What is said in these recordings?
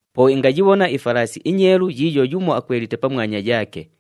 Po ingayibhona ifalaasi inyeelu yiiyo yumo akwelite pamwanya yaake.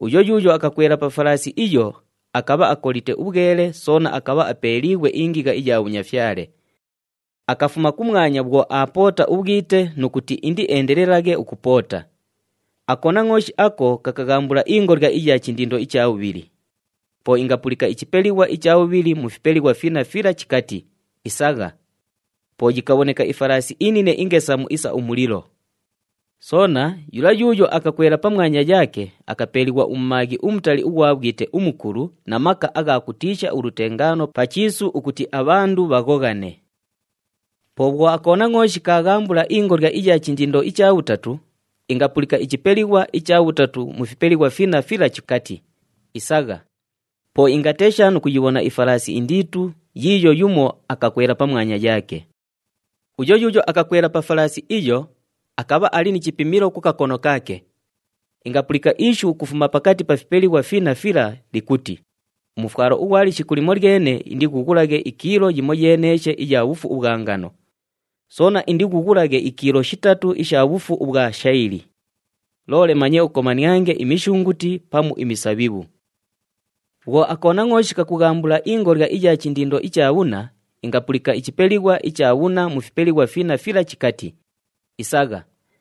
Uyo yuuyo akakwela pa falaasi iyo, akabha akolite ubhwele soona akabha apeeliighwe ingigha iya bhunyafyale. Akafuma kumwanya bhwo aapoota ubhwite nu kuti indieendelelaghe ukupoota. AKonangʼooshi ako kakaghambula ingolya iya chindindo icha bhubhili. Po ingapulika ichipelighwa icha bhubhili mu fipelighwa finna fila chikati, “Isagha!” Po yikabhoneka ifalaasi inine ingesamu isa umulilo. Soona yula yuuyo akakwela pamwanya yaake, akapeeliighwa umumaaghi umutali ughwa bhwite umukulu na maka agha kutiisha ulutengaano pa chiisu ukuti abhandu bhaghoghane. Po bhwo aKonangʼooshi kaaghambula ingolya iya chindindo icha bhutatu, ingapulika ichipelighwa icha bhutatu mu fipelighwa finna fila chikati, “Isagha!” Po ingatesha nu kuyibhona ifalaasi indiitu yiiyo yumo akakwela pamwanya yaake. Uyo yuuyo akakwela pa falaasi iyo, akabha ali ni chipimilo ku kakono kaake. Ingapulika ishu ukufuma pakati pa fipelighwa finna fila likuti, “Umufwalo ughwa lishiku limolyene indighughulaghe ikiilo yimoyeeneeshe iya bhufu ubhwa ngano. Soona indighughulaghe ikiilo shitatu isha bhufu ubhwa shayili. Loole manye ukomaniange imishunguti pamu imisabhibhu.” Bhwo aKonangʼooshi kakughambula ingolya iya chindindo icha bhunna, ingapulika ichipelighwa icha bhunna mu fipelighwa finna fila chikati, “Isagha!”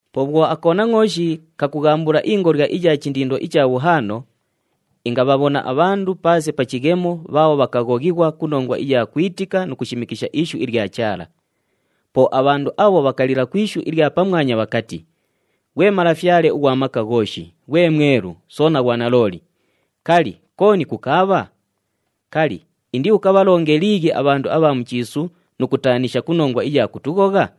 Po bhwo aKonangʼooshi kakughambula ingolya iya chindindo icha bhuhaano, ingabhabhona abhandu paase pa chighemo bhaabho bhakaghoghighwa ku nongwa iya kwitika nu kulishimikisha ishu ilya Chaala. Po abhandu abho bhakalila ku ishu ilya pamwanya bhakati, “Ghwe Malafyale ughwa Maka Ghooshi, ghwe Mwelu, soona ghwa nalooli, kali, kooni kukaabha? Kali, indiukabhalonge liighi abhandu abha mu chiisu nu kutaanisha ku nongwa iya kutughogha?”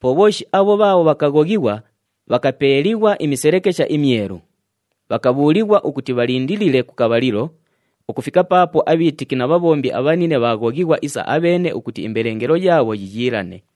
Po bhooshi abho bhaabho bhakaghoghighwa, bhakapeeliighwa imiselekesha imyelu. Bhakabhuulighwa ukuti bhalindilile ku kabhalilo, ukufika paapo abhiitiki na bhabhombi abhanine bhaaghoghighwa isa abheene ukuti imbelengelo yaabho yiiyiilane.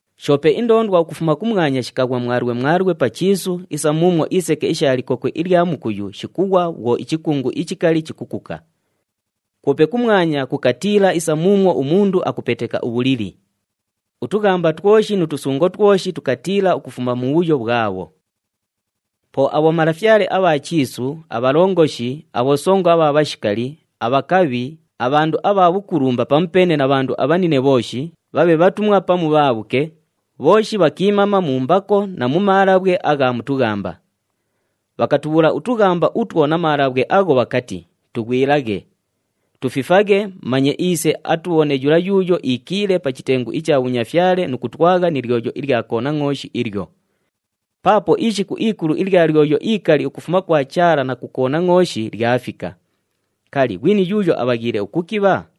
Shoope indoondwa ukufuma kumwanya shikaghwa mwalwe mwalwe pa chiisu isa muumwo iseke isha likokwe ilya mukuyu shikughwa bhwo ichikungu ichikali chikukuka. Kwope kumwanya kukatiila isa muumwo umundu akupeteka ubhulili. Utughamba twoshi nu tusungo twoshi tukatiila ukufuma mubhuyo bhwabho. Po abhomalafyale abha chiisu, abhalongoshi, abhosongo abha bhashikali, abhakabhi, abhandu abha bhukulumba pamupeene na bhandu abhanine bhooshi, bhabhe bhatumwa pamu bhaabhuke, bhooshi bhakiimama mu mbako na mu maalabhwe agha mu tughamba. Bhakatubhuula utughamba utwo na maalabhwe agho bhakati, “Tughwilaghe! Tufifaghe manye iise atubhone yula yuuyo iikiile pa chitengu icha bhunyafyale nu kutwagha ni lyoyo ilya Konangʼooshi ilyo. Paapo ishiku ikulu ilya lyoyo ikali ukufuma kwa Chaala na ku Konangʼooshi lyafika. Kali, ghwini yuuyo abhaghiile ukukibha?”